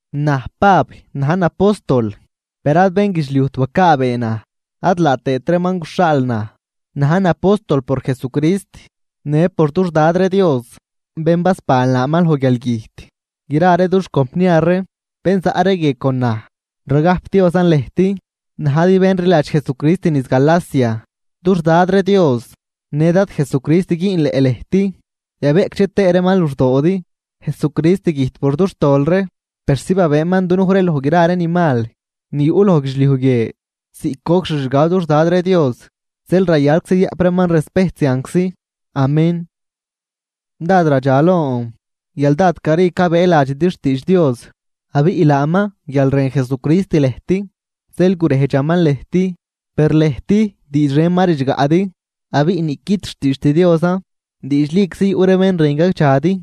Naj Pab najn apóstol, per ad bénguidxliujt bacaabee naj ad laa tëët reeman guxhaal naj, najn apóstol por Jesucrist në por dux Dad ree Dios bén basban laaman loj guialgüjt. Gra ree dux compniar ree bén zaꞌ ree guie con naj ragajpdiozan lëjt najdi bén rliladx Jesucrist niz Galacia. Dux Dad ree Dios në Dad Jesucrist güünleꞌ lëjt yabeꞌcdxe tëë reeman luxdoodi. Jesucrist güjt por dux tol ree persi babëëman dunuj ree loj gra ree ni mal ni yuꞌ loj guidxliuj guie ziꞌc goc xixgab dux Dad ree Dios. Zeel rayalczi yayaꞌp reeman respejt zianczi. Amén Dád radxalon guial dád cari cabëëladxidi xtiidx Dios, abiꞌ laaman guial rën Jesucrist lëjt zeel gurejdxaman lëjt. Per lëjt diidx ren ma ridxgaꞌdi abiꞌ niꞌquid xtiidxt Diosan. Diidxliczi yuꞌ ree bén rën gagdxadi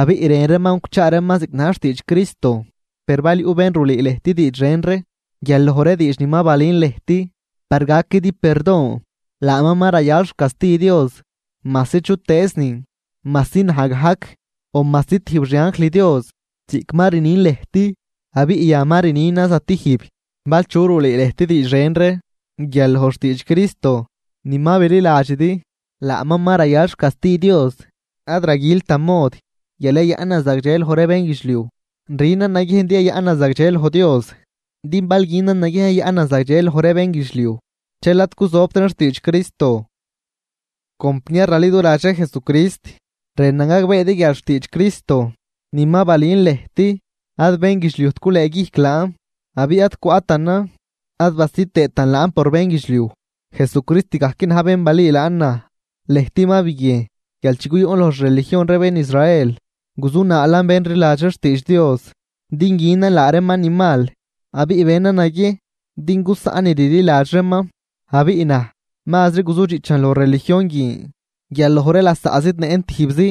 abiꞌ rën reeman guchaa reeman ziꞌc na̱j xtiidx Cristo. Per bal yuꞌ bén rulüü lëjt diidx ren ree guial loj ree diidx ni ma balün lëjt par gaquidi perdon, laaman ma rayal xcasti Dios, majsi chutëëznin majsi naj gajc o majsi tijb xi anjl Dios. Ziꞌc ma rnin lëjt abiꞌ yan ma rninan zatijb: Bal chu rulüü lëjt diidx ren ree guial loj xtiidx Cristo ni ma bililadxidi, laaman ma rayal xcasti Dios. Ad raguiltan mod guial yayaꞌnan zagdxe loj ree bénguidxliuj, rünan naguiejn din yayaꞌnan zagdxe loj Dios. Din bal günan naguiejn yayaꞌnan zagdxe loj ree bénguidxliuj dxel ad cuzobtran xtiidx Cristo. Compniar raliduladx ree Jesucrist, rënan gagbeedi guial xtiidx Cristo ni ma balün lëjt ad bénguidxliujt gulëëguijc laan. Abiꞌ ad cwaꞌtanan ad basid tëëtan laan por bénguidxliuj, Jesucrist gajc na̱j bén balüü laan naj. Lëjt ma biguiejn guial chi guyuꞌn loj xreligion ree bén Israel, guzunaalan bén rliladx ree xtiidx Dios din günan laa reeman ni mal abiꞌ benan naguiejn din gusaꞌn ni rliladx reeman. Abiꞌ naj mazri guzudxiꞌchan loj religion guin guial loj ree lasaꞌ zidnëꞌn tijbzi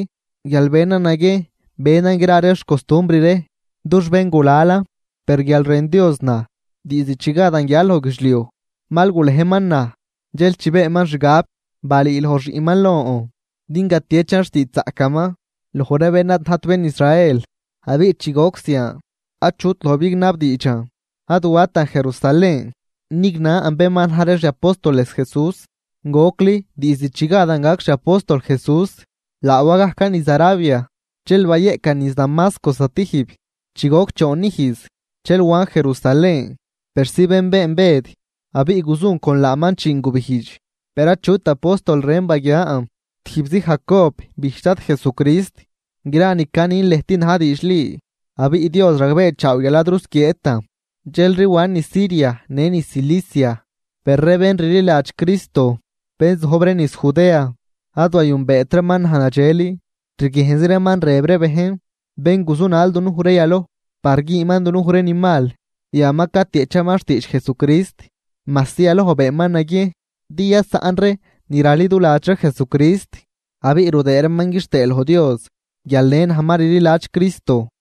guial benan naguiejn benan gra ree xcostumbr ree dux béngulalan. Per guial rën Dios naj, diizd chi gadan guial loj guidxliuj mal gulejman naj. Dxel chi beenman xgab. Balüüloj xiꞌnman lon din gatiechan xtiidxzaꞌcaman loj ree bén ad najt bén Israel. Abiꞌ chi goc zian achut loj bignabdiidxan, ad watan Jerusalén nignan bén ma na̱j ree xi apóstoles Jesús gocli diizd chi gadan gac xi apóstol Jesús, laa wa gajcan niz Arabia dxel bayeꞌcan niz Damasco stijb. Chi goc choon ijz dxel wan Jerusalén persi benbeen Bëd abiꞌ guzun con laaman chiin gubijdx. Per achut apóstol ren baguiaan tijbzi Jacob bijch Dad Jesucrist. Gra ni canin lëjt na̱j diidxli abiꞌ Dios ragbeechaaw guial ad rusquieetan. Dxelri wan niz Siria në niz Silicia. Per ree bén rliladx Cristo, bén zojb ree niz Judea ad wayünbeet reeman naj nadxel. Rguiejnzi reeman rëb ree bejn: “Bén guzunal dunuj ree yaloj par güünman dunuj ree ni mal yan ma catieꞌchaman xtiidx Jesucrist, majsi yaloj beenman naguiejn din yasaꞌn ree ni raliduladx ree Jesucrist.” Abiꞌ rudëë reeman quixtëë loj Dios guial në naj ma rliladx Cristo.